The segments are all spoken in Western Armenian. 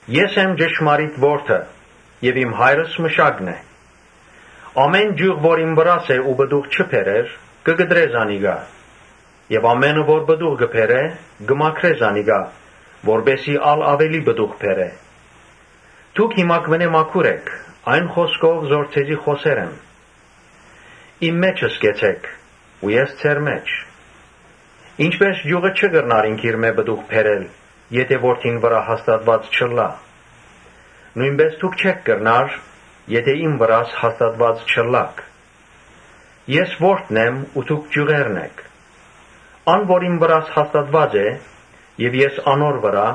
«Ես եմ ճշմարիտ որթը եւ իմ Հայրս մշակն է։ Ամէն ճիւղ որ իմ վրաս է ու պտուղ չի բերեր, կը կտրէ զանիկա։ Ան որ պտուղ կը բերէ, կը մաքրէ զանիկա, որպէս զի ա՛լ աւելի պտուղ բերէ։ Դուք հիմա մաքուր էք այն խօսքով որ ձեզի խօսեր եմ։ Իմ մէջս կեցէք ու ես ձեր մէջ։ Ինչպէս ճիւղը չի կրնար ինքնիրմէ պտուղ բերել, եթէ որթին վրայ հաստատուած չըլլայ, նոյնպէս ալ դուք չէք կրնար՝ եթէ իմ վրաս հաստատուած չըլլաք։ Ես որթն եմ ու դուք ճիւղերն էք։ Ան որ իմ վրաս հաստատուած է՝ եւ ես անոր վրայ,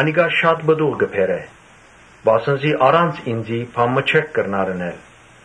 անիկա շատ պտուղ պիտի բերէ, վասն զի առանց ինծի բան մը չէք կրնար ընել։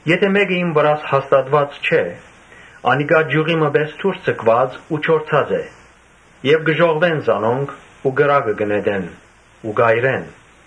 Եթէ մէկը իմ վրաս հաստատուած չէ, անիկա ճիւղի մը պէս դուրս ձգուած ու չորցած է եւ կը ժողվեն զանոնք ու կրակը կը նետեն ու կ’այրեն։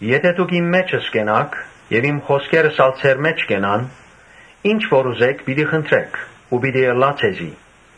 Եթէ դուք իմ մէջս կենաք եւ իմ խօսքերս ալ ձեր մէջ կենան, ի՛նչ որ ուզէք՝ պիտի խնդրէք ու պիտի ըլլայ ձեզի։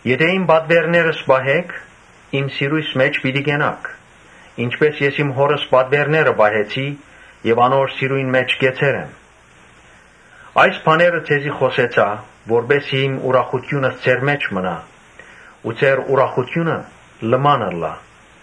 Եթէ իմ պատուէրներս պահէք, իմ սիրոյս մէջ պիտի կենաք, ինչպէս ես իմ Հօրս պատուէրները պահեցի եւ անոր սիրոյն մէջ կեցեր եմ։ Այս բաները ձեզի խօսեցայ, որպէս զի իմ ուրախութիւնս ձեր մէջ մնայ ու ձեր ուրախութիւնը լման ըլլայ։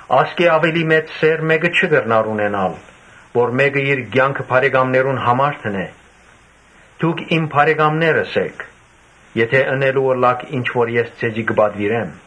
Ասկէ աւելի մեծ սէր մէ՛կը չի կրնար ունենալ, որ մէկը իր կեանքը բարեկամներուն համար դնէ։ Դուք իմ բարեկամներս էք, եթէ ընելու ըլլաք ինչ որ ես ձեզի կը պատուիրեմ։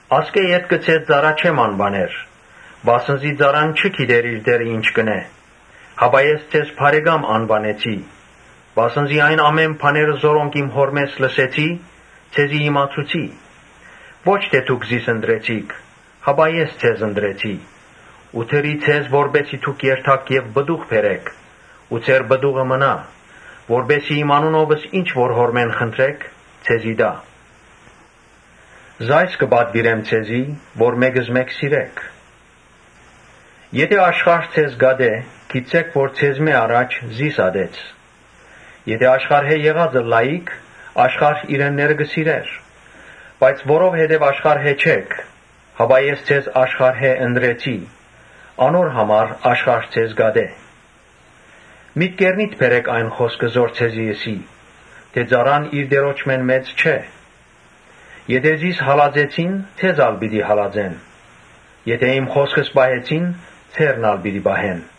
Ասկէ ետքը ձեզ ծառայ չեմ անուաներ, վասն զի ծառան չի գիտեր թէ իր տէրը ի՞նչ կ’ընէ։ Ես ձեզ բարեկամ անուանեցի, վասն զի այն ամէն բաները որոնք իմ Հօրմէս լսեցի, ձեզի իմացուցի։ Ո՛չ թէ դուք զիս ընտրեցիք, հապա ե՛ս ձեզ ընտրեցի ու դրի ձեզ որպէս զի դուք երթաք եւ պտուղ բերէք ու ձեր պտուղը մնայ, որպէս զի իմ անունովս ինչ որ Հօրմէս խնդրէք, ձեզի տայ։ Ասիկա կը պատուիրեմ ձեզի, որ մէկզմէկ սիրէք»։ «Եթէ աշխարհ ձեզ ատէ, գիտցէք թէ ձեզմէ առաջ զիս ատեց։ Եթէ աշխարհէն եղած ըլլայիք, աշխարհ իրենները կը սիրէր. բայց որովհետեւ աշխարհէն չէք, հապա ես ձեզ աշխարհէն ընտրեցի, անոր համար աշխարհ ձեզ կ’ատէ։ Մտքերնիդ բերէք այն խօսքը, որ ձեզի ըսի թէ՝ ‘Ծառան իր տիրոջմէն մեծ չէ’։ Եթէ զիս հալածեցին, ձե՛զ ալ պիտի հալածեն։ Եթէ իմ խօսքս պահեցին, ձե՛րն ալ պիտի պահեն։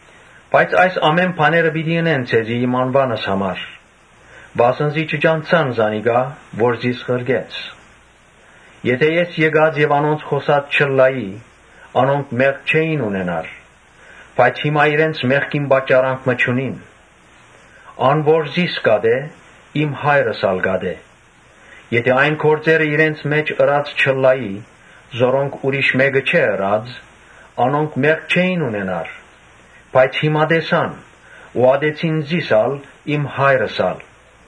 Բայց այս ամէն բաները պիտի ընեն ձեզի՝ իմ անուանս համար, վասն զի չճանչցան զանիկա որ զիս ղրկեց։ Եթէ ես եկած եւ անոնց խօսած չըլլայի, անոնք մեղք չէին ունենար. բայց հիմա իրենց մեղքին պատճառանք մը չունին։ Ան որ զիս կ’ատէ, իմ Հայրս ալ կ’ատէ։ Եթէ այն գործերը իրենց մէջ ըրած չըլլայի, որոնք ուրիշ մէկը չէ ըրած, անոնք մեղք չէին ունենար. բայց հիմա տեսան ու ատեցին զիս ալ, իմ Հայրս ալ։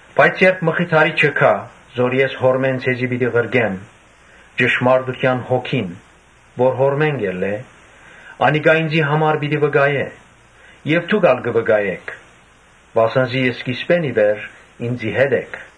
Բայց երբ Մխիթարիչը գայ, որ ես Հօրմէն ձեզի պիտի ղրկեմ, ճշմարտութեան Հոգին՝ որ Հօրմէն կ’ելլէ, անիկա ինծի համար պիտի վկայէ։ Եւ դուք ալ կը վկայէք, վասն զի սկիզբէն ի վեր ինծի հետ էք»։